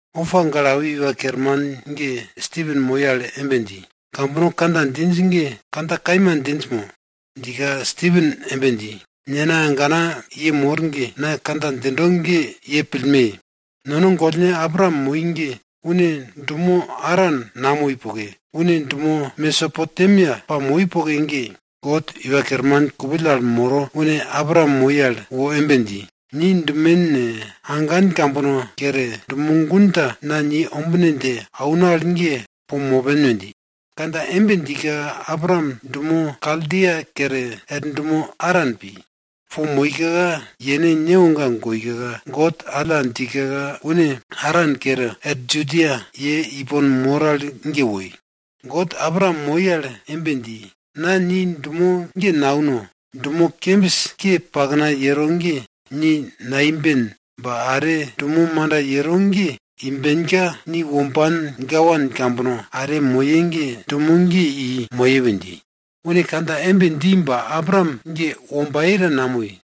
Opa gale awi iwa kerman ge Stipen moi al embe dji, kambono kandja djinj ge kandja kaima djinj mo? Djika Stipen embe dji, nena, agana ye mor ge, na kandja djindo ge ye pillme! Nono gollne Abraam moi ge une dumo Aran namoi poke, une dumo Mesopotemia pamoi poke ge, God Iwa Kerman kupill al moro une Abraam moi al wo embe dji, ni dumen ne, agan kambono kere, dumo gun ta na ni ombine dje auno al ge po mopen we dji. Kandja embe djika, Abraam dumo Kaldia kere, er dumo Aran pi. Po moika yene newoga goika, God alla djika une Aran kere, er Judia, ye ipon mor al ge woi. God Abraam moi al embe dji, na ni dumo ge nauno dumo kembis ke pakna yero ge ni naimben ba are, dumo manda yero ge imbenka, ni womban gawan kambono are moye ge dumo ge i moye we dji. Une kandja embe dji ba Abraam ge wombaye ta namoi.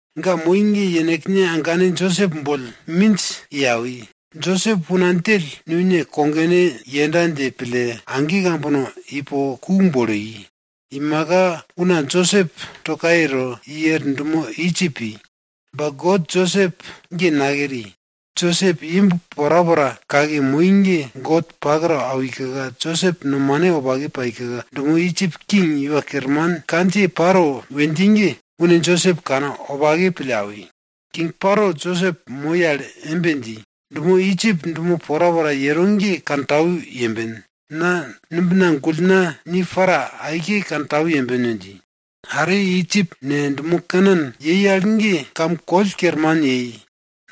Ga moi ge yenekne agane Josep boll minj i awi. Josep una djell nune kogone yenda dje pille, age kambono ipo ku bolo i. Imaka una Josep to kaye to, i er dumo Idjip pi. Ba God Josep ge nakeri. Josep imb porapora kake moi ge God pak to awika, Josep nomane wopake paika, dumo Idjip king iwa kerman kandjiye Paro we dji ge, une Josep kanwopake pille awi. King Paro Josep moi al embe dji, dumo Idjip dumo porapora yero ge kantau yemben na numbina gullna ni para aike kantau yemben we dji. Are Idjip ne, dumo Kanan yei al ge kam koll kerman yei.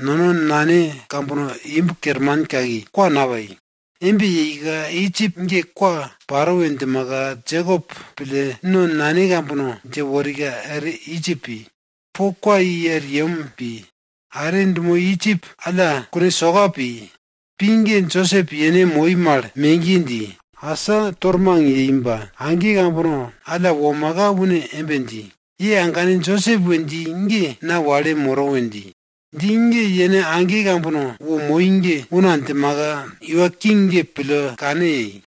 Nono nane kambono imb kerman kaki, kwa napai. Embe yeika, Idjip ge kwa paro we djimaka, Jekop pille no nane kambono dje worika er Idjip pi. Po kwa i er yem pi. Are dumo Idjip alla kune soka pi. Pi ge, Josep yene moi mal megiye dji, asa tormang yei ba age kambono alla womaka une embe dji, ye agane Josep we dji ge na wale moro we dji. Dji ge yene age kambono wo moi ge una djimaka iwa King ge pille kane yei.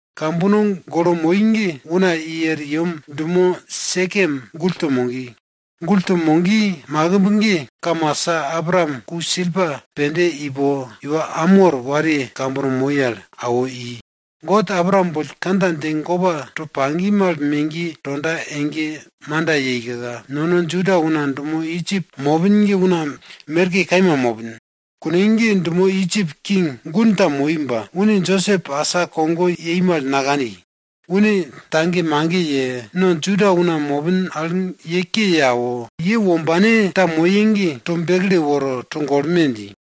Kambono golo moi ge una i er yem dumo Sekem gull to mogi. Gull to mogi makimb ge kamasa Abraam ku silpa pende ipo iwa Amor wariye kambono moi al awo i. God Abraam boll kandja dje gopa to pagi mal megiye tonda ege ge manda yeika, nono Juda una dumo Idjip mopin ge una merke kaima mopin. Kune ge dumo Idjip king gun ta moi ba, une Josep asa kogo yei mal nakani. Une tagemage ye, no Juda una mopin al ye ke ye awo, ye wombane ta moye ge, to bekle woro togolme! dji.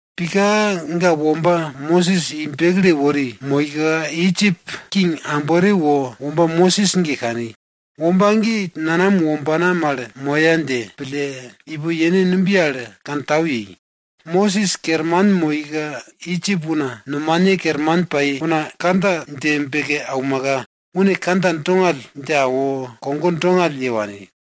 Pika ga womba Mosis i bekle wori moika, Idjip king ambore wo womba Mosis ge kani. Womba ge nanam wombana mal moya dje pille, ipo yene numbiye al kantau yei. Mosis kerman moika, Idjip una nomane kerman pai una kandja dje beke aumaka, une kandja dongall dje awo, kogo dongall ye wani.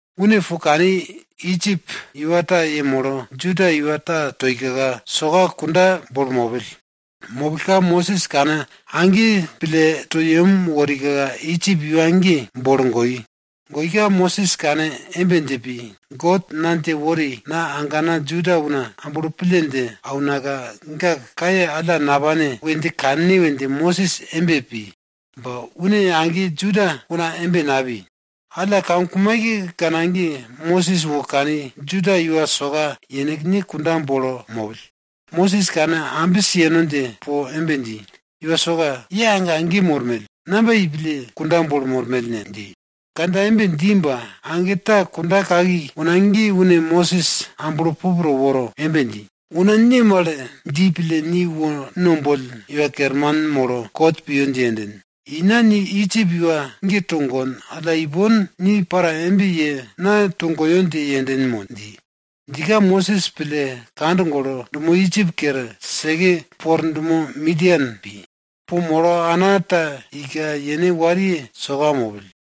Une po kani, Idjip iwa ta yemolo Juda iwa ta toika soka kunda bolo mopill. Mopillka Mosis kane age pille to yem worika Idjip iwa ge bolo goi. Goika Mosis kane embe dje pi, God na dje wori na agana Juda una amblo pille dje aunaka ga kaye alla napane we dje kanne we dje Mosis embe pi ba une age Juda una embe napi. Alla kamkumaikekana ge, Mosis wo kani Juda iwa soka yenekne kunda bolo mopill, Mosis kane ambis yeno dje po embe dji, iwa soka, ye age age mormell, namba yei pille kunda bolo mormell ne? dji. Kandja embe dji ba, age ta kunda kaki una ge une Mosis amblo pup to woro embe dji, una ne mal dji pille ni wo no boll iwa kerman molo kot piyo dje yenden? Ina ni Idjip iwa ta togon alla ipon, ni para embe ye na togoyo dje yenden mo? dji. Djika Mosis pille kand golo, dumo Idjip kere, seke po er dumo Midian pi. Po molo ana ta ika yene wariye soka mopill.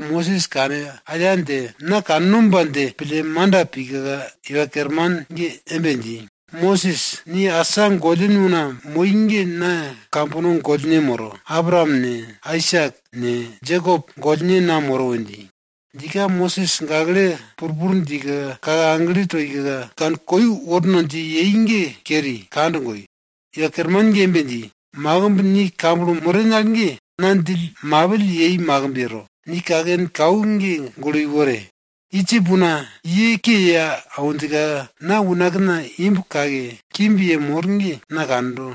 Mosis kane aya dje, na kannomba dje pille manda pika, Iwa Kerman ge embe dji, Mosis ni asa gollin una moi ge na kambono Godne moro. Abraam ne, Aisak ne, Jekop Godne na moro we dji. Djika Mosis gakle purpur djika, kake agle toika, kane koi worno dje yei ge keri, kand goi. Iwa Kerman ge embe dji, makimb ni kamblo moren al ge, na djill mapill yei makimb yero. Ni kaken kau ge gulo iwore! Idjip una ye ke ye awinjka na unakna imb kake, kimb yemor ge na kando.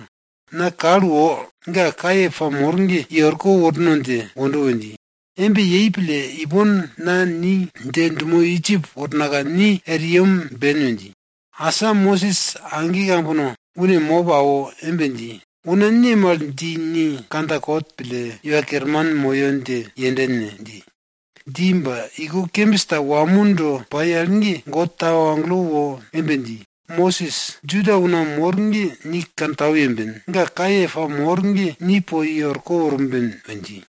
Na kal wo ga kaye pamor ge i orko worno dje wondo we dji. Embe yei pille, ipon na ni dje dumo Idjip wornaka ni er yem ben! we dji. Asa Mosis age kambono une mop awo embe dji, una ne mal dji ni kandja kot pille, iwa kerman moyo dje yenden ne? dji. Dji ba iko kembis ta wamo do pai al ge God tau agelo wo embe dji, Mosis, Juda una mor ge ni kantau yemben. Ga kaye pamor ge ni po i orko worben we dji.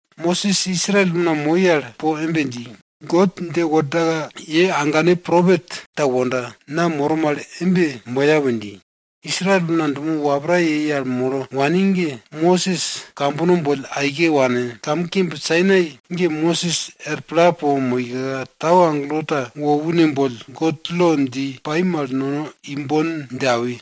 Mosis Israel una moi al po embe dji, God dje worda ye agane propet ta wonda, na moro mal embe moya we dji. Israel una dumo wapra yei al molo wani ge, Mosis kambono boll aike wane, kamkimb Sainai ge Mosis er pla po moika, tau agelo ta wo une boll God lo dji pai mal nono imbon dje awi.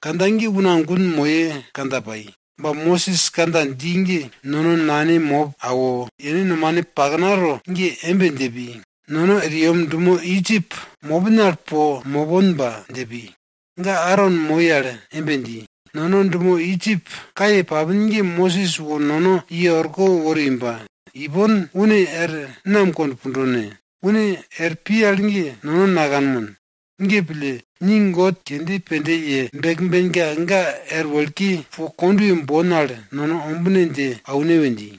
Kandja ge una gun moye kandja pai. Ba Mosis kandja dji ge nono nane mop awo, yenekne nomane paknato ge embe dje pi, nono er yem dumo Idjip mopin al po moponba dje pi. Ga Aron moi al embe dji, nono dumo Idjip kaye papin ge Mosis wo nono i orko wori ba, ipon une er nam kond pundo ne? Une er pi al ge nono nakanmon. Ge pille, ni god kende pende ye bekbenka ga er wekle po kondwe bon al nono ombine dje aune we dji.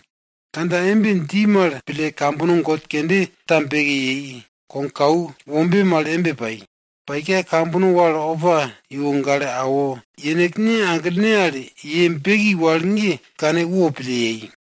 Kandja embe dji mal pille, kambono god kende ta beke yei. Kogkau wombe mal embe pai. Paika, kambono wal opa iwo gale awo, yenekne aglene al ye beki wal ge kane wopille yei.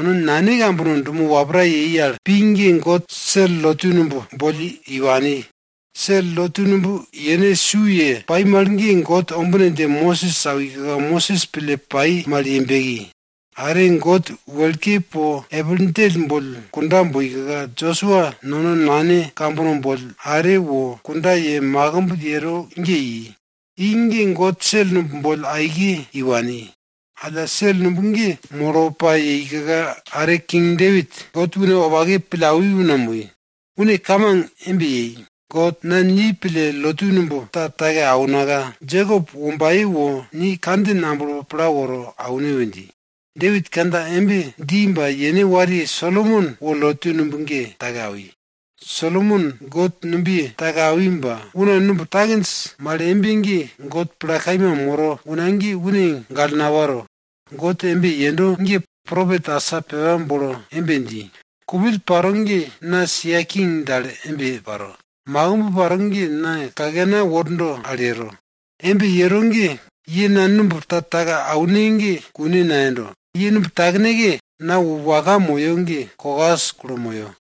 No nane kambono dumo wapra yei al pi ge God sel lotu numb boll i wani. Sel lotu numb yene su ye pai mal ge God ombine dje Mosis awika Mosis pille pai mal ye beki. Are God wekle po epil djell boll kunda boika, Josua nono nane kambono boll are wo kunda ye makimb yero ge i. I ge God sel numb boll aike i wani. Alla, sel numb ge molo pa yeika are King Depit God une wopake pille awi una moi. Une kamang embe yei, God, na ni pille lotu numb ta take aunaka, Jekop wombaye wo ni kandjin amblo pla woro aune we dji. Depit kandja embe dji ba yene wariye Solomon wo lotu numb ge take awi. Solomon God numbiye take awi ba, una numb takinj mal embe ge God pla kaima moro una ge une gale naparo. God embe yendo ge propet asa pepa bolo embe dji, Kupill paro ge na sia king dal embe paro, makimb paro ge na kakena wordo al yero. Embe yero ge, ye na numb ta take aune ge kune nayendo. Ye numb takneke na wo waka moyo ge kokas kulo moyo.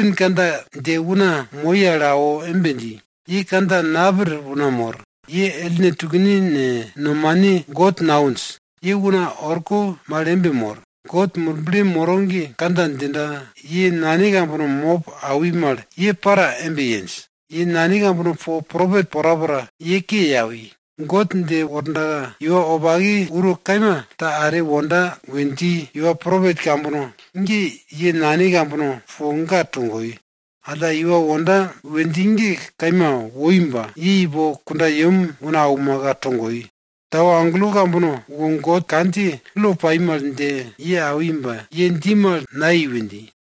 Stipen kandja dje una moi al awo embe dji, ye kandja napir una mor! Ye ellne tukne ne, nomane God nawinj, ye una orko mal embe mor. God Murble moro ge kandja djika, ye nane kambono mop awi mal ye para embe yenj. Ye nane kambono po propet porapora ye ke ye awi. God dje worda iwa wopake uro kaima ta are wonda we dji iwa propet kambono ge ye nane kambono po ga togoi. Alla, iwa wonda we dji ge kaima woi ba, ye ipo kundayem una aumaka togoi. Tau agelo kambono wo God kandjiye lo pai mal dje ye awi ba ye dji mal nayei we dji.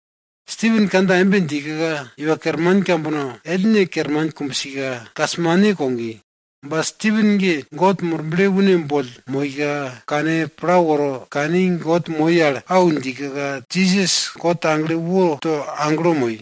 Stipen kandja embe djika, iwa kerman kambono ellne kerman kumbsika kasmane kogi. Ba, Stipen ge God Murble une boll moika, kane pla woro kani, God moi al au djika, Jisas God agle woto aglo moi.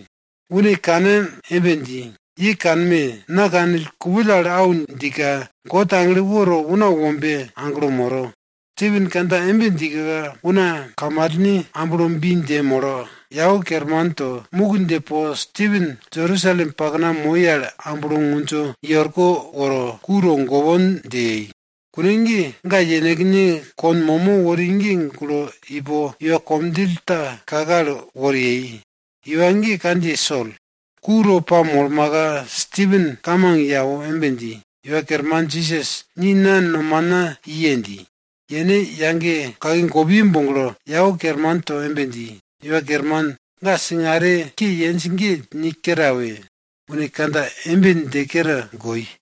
Une kane embe dji, ye kanme! Na kanill, kupill al au djika, God agle woto Una Wombe aglo moro. Stipen kandja embe djika, una kamalne amblo bi dje molo, yau kerman to muk dje po Stipen Jerusalem pakna moi al amblo ngundjo, i orko woro, ku togopon dje yei. Kune ge, ga yenekne kon momo wori ge gulo ipo iwa komdjill ta kake al wori yei. Iwa ge kandjiye Sol. Ku to pamolmaka, Stipen kamang ye awo embe dji, Iwa Kerman Jisas, ni na nomana iye dji. Yene yage kake gopiye boglo, yau kerman to embe dji, Iwa Kerman, ga singare ke yenj ge ni kere awe! Une kandja embe dje kere goi.